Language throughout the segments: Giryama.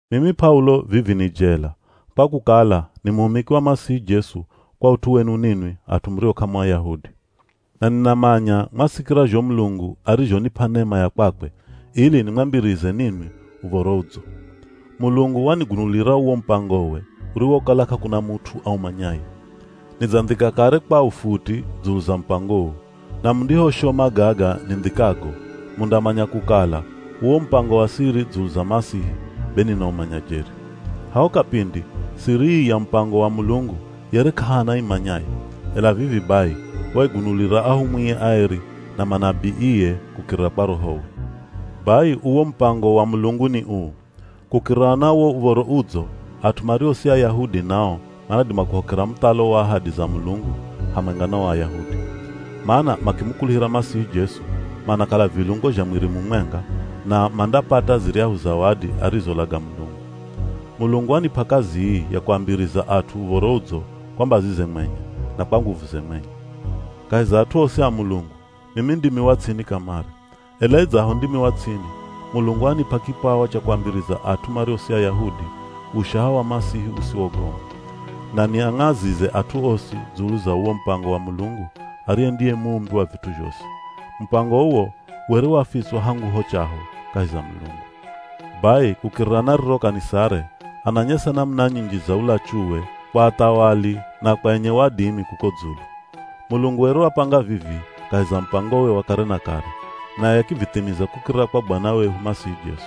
Mimi P'aulo vivi ni jela, kwa kukala ni muhumiki wa Masihi Jesu kwa ut'u wenu ninwi at'u murio k'amu Ayahudi. Na ninamanya mwasikira zho Mulungu arizhonip'a nema ya kwakwe, ili nimwambirize ninwi Uv̱oro Udzo. Mulungu wanigunulira uwo mupangowe uriwokala k'akuna mut'u aumanyaye. Nidzandhika kare kwa ufuti dzulu za mupango uu. Na mundihoshoma gaga nindhikago, mundamanya kukala, uwo mupango wa siri dzulu za Masihi be ninaumanya jeri. Haho kapindi, siri ii ya mupango wa Mulungu yere k'ahana aimanyaye, ela vivi bai, waigunulira ahumwie aeri na manabiie kukirira kwa Rohowe. Bai uwo mupango wa Mulungu ni uu: Kukirira na wo Uv̱oro Udzo, at'u mario si Ayahudi nao manadima kuhokera muthalo wa ahadi za Mulungu hamwenga na o Ayahudi. Mana makimukuluhira Masihi Jesu, manakala vilungo zha mwiri mumwenga, na mandapata ziryahu zawadi arizolaga Mulungu. Mulungu wanip'a kazi ii ya kuambiriza at'u Uv̱oro Udzo kwa mbazize mwenye, na kwa nguvuze mwenye. Kahi za at'u osi a Mulungu, mimi ndimi wa ts'ini kamare. Ela idzaho ndimi wa ts'ini, Mulungu wanip'a kipawa cha kuambiriza at'u mario si Ayahudi, ushaha wa Masihi usiwogoma. Na niang'azize at'u osi dzulu za uwo mupango wa Mulungu ariye ndiye muumbi wa vit'u zhosi. Mupango uwo were wafitswa hangu ho chaho kahi za Mulungu. Bai kukirira na riro kanisare, ananyesa namuna nyinji za ulachuwe kwa athawali na kwa enye wadimi kuko dzulu. Mulungu were wapanga vivi kahi za mupangowe wa kare na kare, naye akivithimiza kukirira kwa Bwana wehu Masihi Jesu.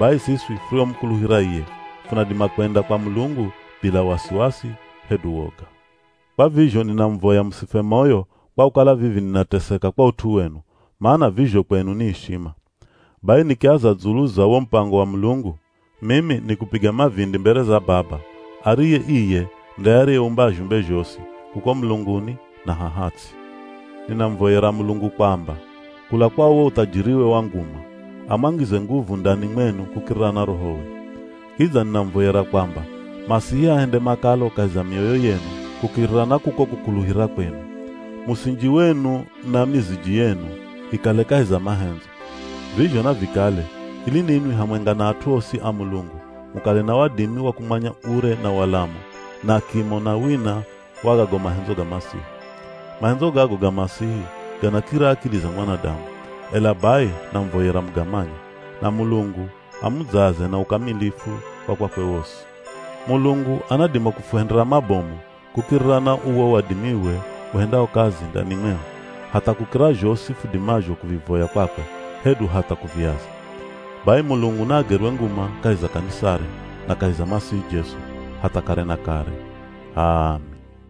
Bai siswi furiomukuluhira iye, funadima kwenda kwa Mulungu bila wasiwasi hedu woga. Kwa vizho ninamuvoya musifwe moyo, kwa kukala vivi ninateseka kwa ut'u wenu, mana vizho kwenu ni ishima. Bai nikiaza dzulu za wo mupango wa Mulungu, mimi nikupiga mavindi mbere za Baba, ariye iye nde ariyeumba zhumbe zhosi, kuko mulunguni na haha ts'i. Ninamuvoyera Mulungu kwamba, kula kwa uwo uthajiriwe wa nguma, amwangize nguvu ndani mwenu kukirira na Rohowe. Kidza ninamuvoyera kwamba Masihi ahende makalo kahi za mioyo yenu kukirira na kuko kukuluhira kwenu. Musinji wenu na miziji yenu ikale kahi za mahendzo. Vizho navikale ili ninwi hamwenga na at'u osi a Mulungu mukale na wadimi wa kumanya ure na walamu, na kimo na wina wa gago mahendzo ga Masihi. Mahendzo gago ga Masihi ganakira akili za mwanadamu, ela bai namuvoyera mugamanye, na Mulungu amudzaze na ukamilifu wa kwakwe wosi. Mulungu anadima kufuhendera mabomu kukirira na uwo wadimiwe uhendao kazi ndani mwehu, hatha kukira zhosi fudimazho kuvivoya kwakwe, hedu hatha kuviaza. Bai Mulungu naagerwe nguma kahi za kanisare na kahi za Masihi Jesu, hatha kare na kare! H'aami.